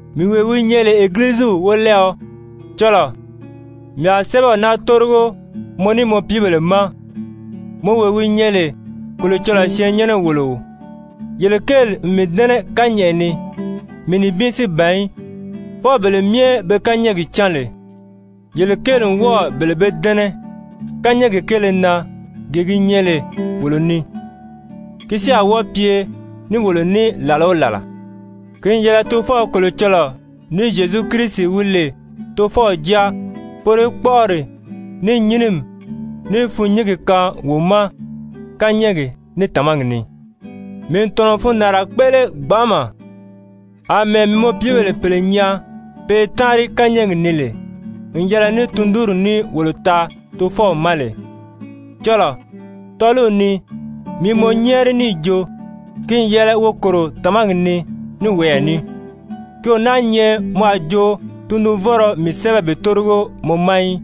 Mii wee wi nyɛ lè Egiliziw wolɛɛɔ, cɔlɔɔ, mii a sɛ́bɛw naa tórigo mɔ ní mɔ piibèle ma, mɔ wee wi nyɛ lè Kolocɔlɔɔ syɛɛnnyɛnɛ-wòloo. Yele kéeli n mii dɛ́nɛ kányɛʔɛ ni, mii nibin si ban í, fwɔɔ bele myɛ be kányɛɛgi cán lè, yele kéeli n wɔ́ɔ̀ bele bee dɛ́nɛ kányɛɛgi kéele na gee gi nyɛ lè wolo ni, ki si a wɔ́ɔ pye ní wolo ní làla o làla. Ki n yɛlɛ Tofɔw Kolocɔlɔɔ ní Zyezu Kirisi wi lè Tofɔw Jáa, poro í kpɔ́ʔɔri, ní nyínimi, ní fûnnyingi kaan wo ma kányɛɛgi, ní tàmagi ni. Mii n tɔ̀nɔ n fundaanra kpéʔele gbanʔama, àmɛɛ mii mɔ piibèle pèle nyaa pe i táanri kányɛɛgi ni lè n yɛlɛ ní tundunri ní wolo taa Tofɔw ma lè. Cɔlɔɔ, tɔ́ɔliw ni mii i mɔ nyɛ́ɛri níì jo ki n yɛlɛ wo kòro tàmagi ni ní woyɛɛ ní, ki o náā nyɛ mɔ a jo tundunvɔ́nrɔ mii sɛ́bɛ bi tórigo mɔ ma í,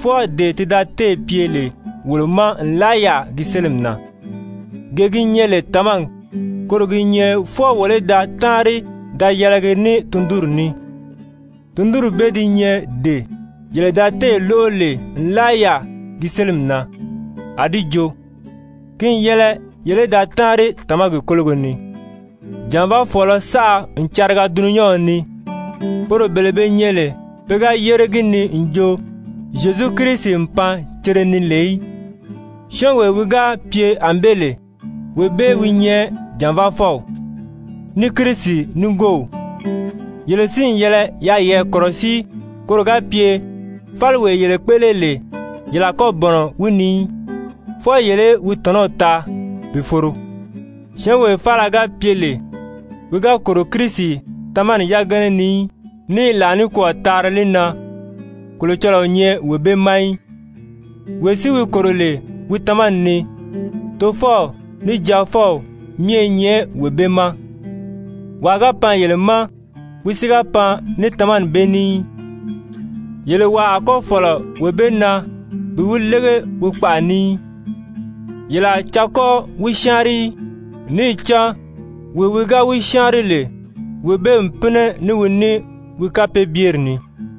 fwɔɔ dee ti da téè pye lè wolo ma nlaa yaà gi sélimi na. Gee gi nyɛ lè tàmagi, koro gi nyɛ fwɔɔ wolo í da táanri da yɛlɛgi ní wi tundunri ní. Tundunri bee di nyɛ dee yele da téè lóʔo lè nlaa yaà gi sélimi na, a di jo, ki n yɛlɛ yele í da táanri tàmagi kólogo ni. Jànvaafɔɔlɔ saʔa n cariga dulunyanw ni, poro bele be nyɛ lè pe ga yére gi ni n jo Zyezu Kirisi n pan cere ni lè í. Syɔ́ɔnwee wi ga pye ànbée lè, wee bee wi nyɛ jànvaafɔw, ní Kirisi nigoow. Yele si n yɛlɛ yaa yeyɛɛ kɔ̀rɔsíi koro ga pye fáliwee yele kpéʔele lè, yele a kɔ́ bɔ̀nɔ wi ni í, fwɔɔ yele í wi tɔ̀nɔw taa bi foro. Syɔ́ɔnwee faala ga pye lè wi ga kòro Kirisi tamani yagana ni í, ní i làa nikwɔɔ taari li na, Kolocɔlɔɔ o nyɛ wee bee ma í. Wee si wi kòro lè wi tamani ni, Tofɔw ní Jaafɔw myɛ i nyɛ wee bee ma. Wàa ga pan yele ma, wi si ga pan ní tamani bee ní í, yele wàa a kɔ́ fɔ̀lɔ wee bee na bi wi lége wi kpaʔa ni í, yele a caa kɔ́ wi syáanri í! Níì cán wee wi ga wi syáanri lè, wee bee n pínɛ ní wi ní wi kapeebyeri ni.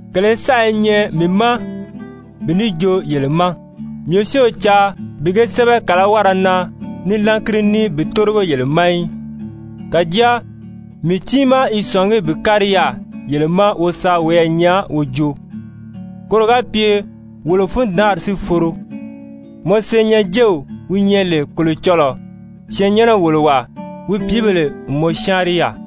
Kèlē saʔa i nyɛ mii ma bi ní joo yele ma, mii si o caa bi ge sɛ́bɛ kàlawara na ní lángiri ní bi tórigo yele ma í. Kàjáa mii tiimaa i sɔ̀ngí bi kári yaà yele ma wo sa woyɛɛ nyaa wo joo, koro ga pye wolo fundaanri si foro. Mɔ senyɛnjew wi nyɛ lè Kolocɔlɔɔ syɛɛnnyɛnɛ-wòlowaa, wi pìíbèle n mɔ syáanri yaà.